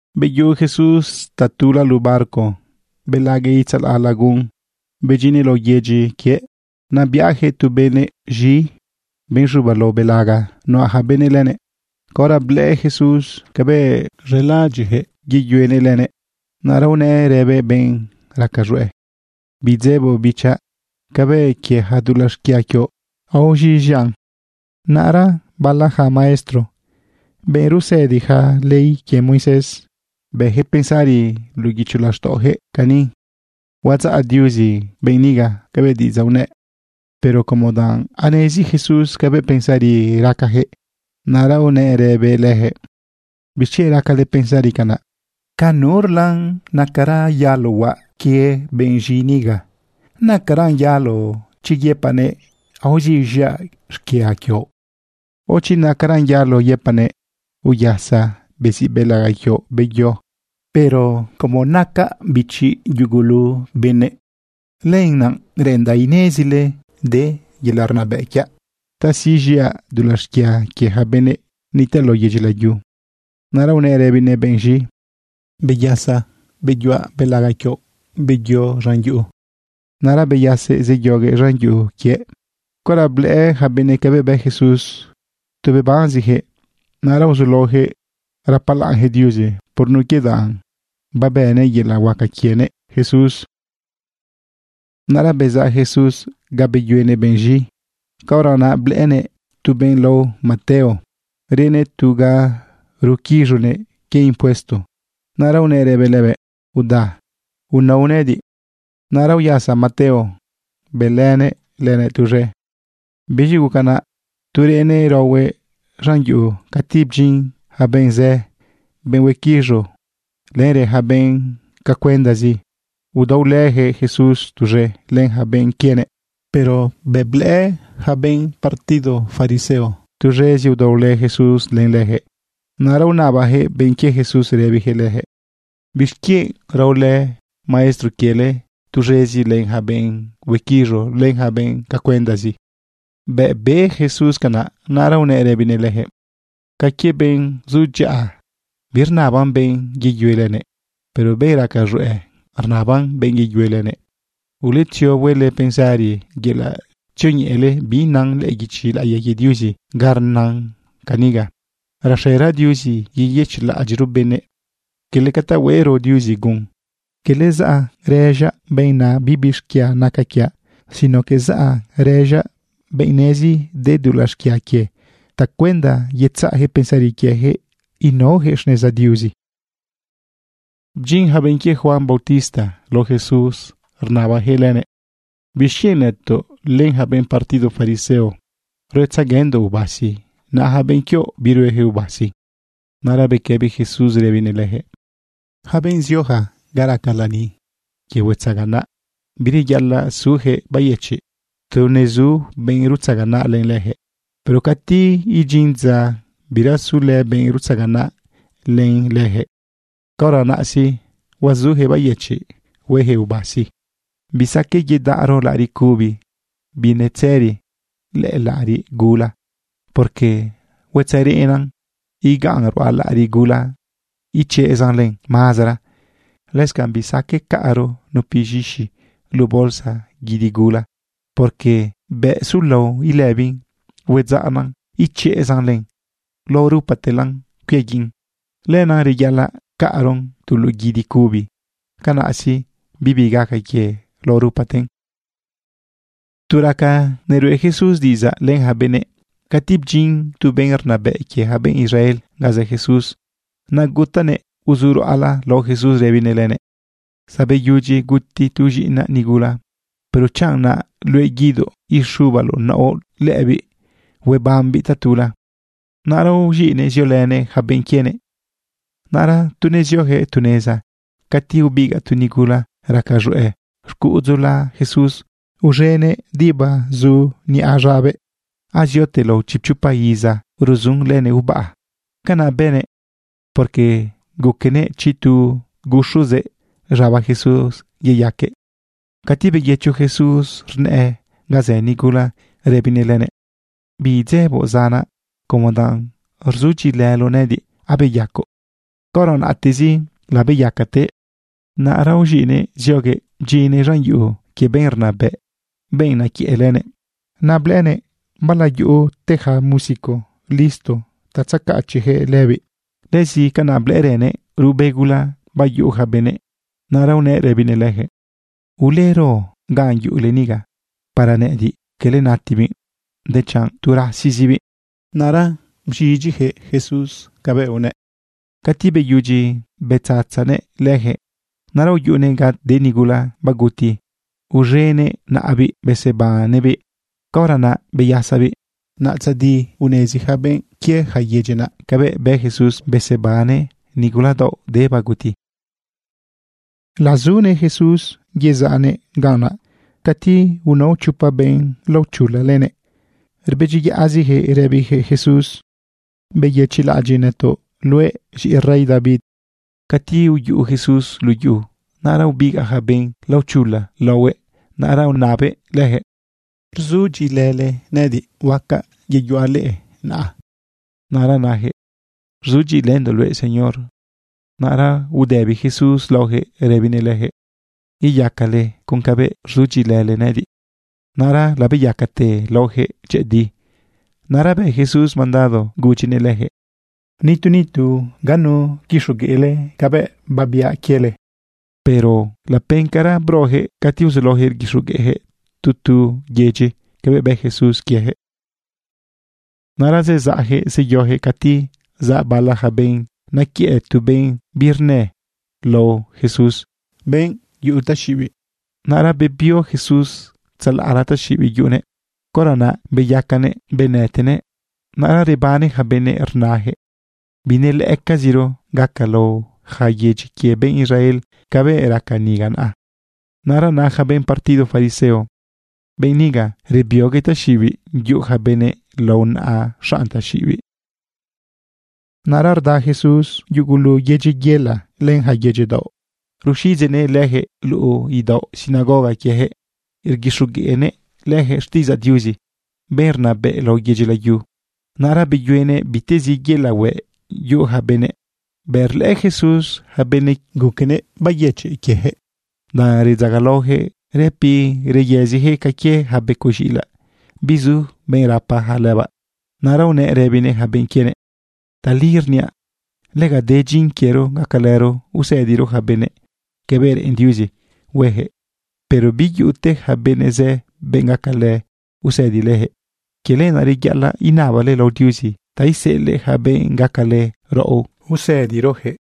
Beyuꞌu Jesús tatula luꞌu barco. Belaꞌguëꞌ itzalaꞌ lagun, bedyinnëꞌ lao yedyi quiëꞌ. Naꞌ biꞌajëꞌ tu benëꞌ z̃i, benꞌ z̃uba lao belaga nuꞌa ja benëꞌ lënëꞌ. Caora blëꞌë Jesús cabëꞌ z̃elaꞌadyiꞌyaquëꞌ yeyuenëꞌ lënëꞌ, naꞌra unëꞌ rëbëꞌ benꞌ raca z̃hueꞌ: ―Bidzeboꞌ, bichaꞌ. Cabëꞌ quie ja dulaꞌ xquia quioꞌ, aoz̃iꞌz̃iaꞌn. Naꞌra bala ja maestro, benꞌ rusëdija ley quie Moisés, bëjëꞌ pensari luꞌu guicho laxtaꞌojëꞌ cani: “Huadzaꞌ Diuzi benꞌ niga cabëꞌ diꞌidzaꞌ unëꞌ.” Pero como danꞌ anezi Jesús cabëꞌ pensari racajëꞌ, naꞌra unëꞌ rëbëꞌ lëjëꞌ: ―¿Bixquienꞌ racale pensari canaꞌ? ¿Ca nurlan nacaran yalo huaꞌ quie benꞌ z̃i niga? ¿Nacaran yalo chi yëpaꞌnëꞌ: “Aoz̃iꞌz̃iaꞌ xquia quioꞌ”, o chi nacaran yalo yëpaꞌnëꞌ: “Uyasa, beziꞌ belaga quioꞌ, beyo”? Pero como nacaꞌ bichi yugulu benëꞌ, lenaꞌ reꞌendaꞌ inezile de yelaꞌ rnabëꞌ quiaꞌ ta siꞌz̃iaꞌ dulaꞌ xquia quie ja benꞌ nitaꞌ lao yedyi layu. Naꞌra unëꞌ rëbinëꞌ benꞌ z̃i: ―Beyasa, beyuꞌa belaga quioꞌ. Beyo z̃an yuꞌu. Naꞌra beyasëꞌ zeyoguëꞌ z̃an yuꞌu quiëꞌ. Caora blëꞌë ja benëꞌ cabëꞌ bë Jesús, tu bebanezijëꞌ. Naꞌra uzulaojëꞌ rapalaꞌnjëꞌ Diuzi por nun quie danꞌ babëꞌnëꞌ yelaꞌ huaca quienëꞌ Jesús. Naꞌra bezaꞌ Jesús ga beyuenëꞌ benꞌ z̃i, caora naꞌ blëꞌënëꞌ tu benꞌ lao Mateo, reꞌnëꞌ tu ga ruquiz̃unëꞌ quie impuesto. Naꞌra unëꞌ rëbëꞌ lëbëꞌ: ―Uda, unao nëꞌëdiꞌ. Naꞌra uyasa Mateo bëlënëꞌ lënëꞌ tuz̃e. Biz̃i guca naꞌ tu reꞌnëꞌ raohuëꞌ z̃an yuꞌu, cati bdyin ja benꞌ zë, benꞌ huequiz̃u, lenrë ja benꞌ cacuendazi. Udaolëjëꞌ Jesús tuz̃e len ja benꞌ quienëꞌ. Pero bëꞌ blëꞌë yaca benꞌ partido fariseo tuz̃ezi udaolë Jesús len lëjëꞌ, naꞌra unabajëꞌ benꞌ quie Jesús rëbijëꞌ lëjëꞌ: ―¿Bixquienꞌ raolë maestro quiele tuz̃ezi len ja benꞌ huequiz̃u len ja benꞌ cacuendazi? Bëꞌ be Jesús canaꞌ, naꞌra unëꞌ rëbinëꞌ lëjëꞌ: ―Ca quie benꞌ zu dyaꞌa, birnaban benꞌ yeyue lënëꞌ. Pero benꞌ raca z̃hueꞌ, rnaban benꞌ yeyue lënëꞌ. Uletzio huele pensari yelaꞌ tzioñeꞌele bi nan lëꞌë guichi laꞌiya quie Diuzi ga rnan caniga: “Raxera Diuzi yeyëchiꞌlaꞌadyiꞌro benëꞌ, quele ca ta hueꞌro Diuzi gun.” Quele zaꞌ rëz̃aꞌ benꞌ na “bibi xquia naca quiaꞌ”, sino que zaꞌ rëz̃aꞌ benꞌ nezi de dulaꞌ xquia quie tacuenda yetzaꞌjëꞌ pensari quiejëꞌ inaojëꞌ xneza Diuzi. Bdyin ja benꞌ quie Juan bautista lao Jesús rnabajëꞌ lënëꞌ: ―¿Bixquienꞌ nëtoꞌ len ja benꞌ partido fariseo ruetzeguendoꞌ ubasi, naꞌ ja benꞌ quioꞌ biruejëꞌ ubasi? Naꞌra bequëbi Jesús rëbinëꞌ lëjëꞌ: ―Yaca benꞌ zioja ga raca lani quie huetzaganaꞌ, bireyaꞌalaꞌ sujëꞌ bayëchiꞌ tu nezu benꞌ rutzaganaꞌ len lëjëꞌ. Pero cati idyin dza birazulë benꞌ rutzaganaꞌ len lëjëꞌ, caora naꞌ sí, huazujëꞌ bayëchiꞌ huejëꞌ ubasi. ’Bisaqueꞌ yedaꞌro laꞌariꞌ cubi binetzëri lëꞌë laꞌariꞌ gula, porque huetzereꞌnan igan ruꞌa laꞌariꞌ gula, ichezan len mazara. Lëscanꞌ bisaqueꞌ caꞌro nupi z̃ixi luꞌu bolsa guidi gula, porque bëꞌ sulao ilëbin, huedzaꞌn ichezan len. Lao rupatelan cuiaguiꞌ. Lenaꞌ reyaꞌalaꞌ caꞌron tu luꞌu guidi cubi. Canaꞌ sí, bibi gaca quie lao rupaten. Tu raca nerueꞌ Jesús diꞌidzaꞌ len ja benëꞌ, cati bdyin tu benꞌ rnabëꞌ quie ja benꞌ Israel ganꞌ zë Jesús. Naꞌ gutanëꞌ uzuruꞌala lao Jesús rëbinëꞌ lënëꞌ: ―Zabeyudyi guti tu z̃iꞌinaꞌ nigula. Pero chanꞌ naꞌ luëꞌ guidoꞌ ixubaloꞌ naoꞌ lëbiꞌ, huebambiꞌ tatula. Naꞌra uz̃iꞌnëꞌ ziolënëꞌ ja benꞌ quienëꞌ. Naꞌra tu neziojëꞌ tu neza, cati ubigaꞌ tu nigula raca z̃hueꞌ xcuꞌudzula Jesús, uz̃enëꞌ diba zu niꞌa z̃abëꞌ. Aziote lao chipchopa iza ruzun lënëꞌ ubaꞌa. Canaꞌ bënëꞌ porque guquenëꞌ chi tu guxuzëꞌ z̃aba Jesús, yeyaquëꞌ. Cati beyëcho Jesús rnëꞌë ga zë nigula, rëbinëꞌ lënëꞌ: ―Bidzeboꞌ, zanaꞌ. Como danꞌ rzudyiꞌilëloꞌ nëꞌëdiꞌ, abeyacoꞌ. Caora naꞌtezi labeyacatëꞌ. Naꞌra uz̃iꞌnëꞌ zioguëꞌ bdyinnëꞌ z̃an yuꞌu quie benꞌ rnabëꞌ, benꞌ nequiëꞌ lënëꞌ. Naꞌ blëꞌënëꞌ bala yuꞌute ja músico listo ta tzecachiꞌjëꞌ lëbiꞌ. Lëzi canaꞌ blëꞌërënëꞌ ruꞌbe gula bayuꞌuja benëꞌ. Naꞌra unëꞌ rëbinëꞌ lëjëꞌ: ―Ulero ga yuꞌule niga. Para nëꞌëdiꞌ quele natibiꞌ, dechanꞌ tu rasizibiꞌ. Naꞌra bz̃idyijëꞌ Jesús cabëꞌ unëꞌ. Cati beyudyi betzatzanëꞌ lëjëꞌ, naꞌra uyuꞌunëꞌ ga de nigula baguti, uz̃enëꞌ naꞌabiꞌ besebannëꞌbiꞌ. Caora naꞌ beyasabiꞌ. Naꞌ tzadi unezi ja benꞌ quie ja yedyi naꞌ cabëꞌ bë Jesús besebannëꞌ nigula daoꞌ de baguti. Lazune Jesús yezaꞌnëꞌ ganꞌ naꞌ cati unao chopa benꞌ laochula lënëꞌ. Rbedyiyaꞌzijëꞌ rëbijëꞌ Jesús: ―¡Beyëchiꞌlaꞌadyiꞌ nëtoꞌ, luëꞌ z̃iꞌi rey David! Cati uyuꞌu Jesús luꞌu yuꞌu, naꞌra ubigaꞌja benꞌ laochula laohuëꞌ, naꞌra unabëꞌ lëjëꞌ: ―¿Rzudyiꞌilële nëꞌëdiꞌ huacaꞌ yeyuaꞌ leꞌe naꞌ? Naꞌra najëꞌ: ―Rzudyiꞌilëndoꞌ luëꞌ, Señor. Naꞌra udëbi Jesús laojëꞌ rëbinëꞌ lëjëꞌ: ―Yeyacale con cabëꞌ rzudyiꞌilële nëꞌëdiꞌ. Naꞌra labeyacate laojëꞌ dyëꞌëdi. Naꞌra bë Jesús mandado gudyinëꞌ lëjëꞌ: ―Nitu nitu biquixogueꞌle cabëꞌ biaꞌ quiele. Pero lapencara brojëꞌ cati uzulaojëꞌ rguixogueꞌjëꞌ tu tu yedyi cabëꞌ bë Jesús quiejëꞌ. Naꞌra zezaꞌjëꞌ zeyojëꞌ cati zaꞌ bala ja benꞌ nequiëꞌ tu benꞌ birnë lao Jesús, benꞌ yuꞌu taxiꞌibiꞌ. Naꞌra bebio Jesús tzalaꞌla taxiꞌibiꞌ yuꞌunëꞌ. Caora naꞌ beyacanëꞌ benëtenëꞌ. Naꞌra rebane ja benëꞌ rnajëꞌ: ―Binelëꞌëcaziro gaca lao ja yedyi quie benꞌ Israel cabëꞌ raca niga naꞌa. Naꞌra na ja benꞌ partido fariseo: ―Benꞌ niga rebioguëꞌ taxiꞌibiꞌ yuꞌu ja benëꞌ lao naꞌa xanꞌ taxiꞌibiꞌ. Naꞌra rda Jesús yugulu yedyi yela len ja yedyi daoꞌ, ruxiꞌdzeꞌnëꞌ lëjëꞌ luꞌu idaoꞌ sinagoga quiejëꞌ. Rguixogueꞌnëꞌ lëjëꞌ xtiꞌidzaꞌ Diuzi, benꞌ rnabëꞌ lao yedyi layu. Naꞌra beyuenëꞌ bitezi yelaꞌ hueꞌ yuꞌu ja benëꞌ. Bëꞌ rlëꞌë Jesús ja benëꞌ, guquenëꞌ bayëchiꞌ quiejëꞌ, danꞌ redzagalaojëꞌ rëpi reyëzijëꞌ ca quie ja becoꞌ z̃iꞌilaꞌ bizu benꞌ rapa ja lëbaꞌ. Naꞌra unëꞌ rëbinëꞌ ja benꞌ quienëꞌ: ―Tali rniaꞌ, lega de dyin quiero gacalëro usëdiro ja benëꞌ cabëꞌ reꞌen Diuzi huejëꞌ, pero biyuꞌute ja benꞌ zë, benꞌ gacalë usëdi lëjëꞌ. Quie lenaꞌ naꞌ, reyaꞌalaꞌ inabale lao Diuzi ta iseꞌelëꞌ ja benꞌ gacalë raꞌo usëdi lëjëꞌ.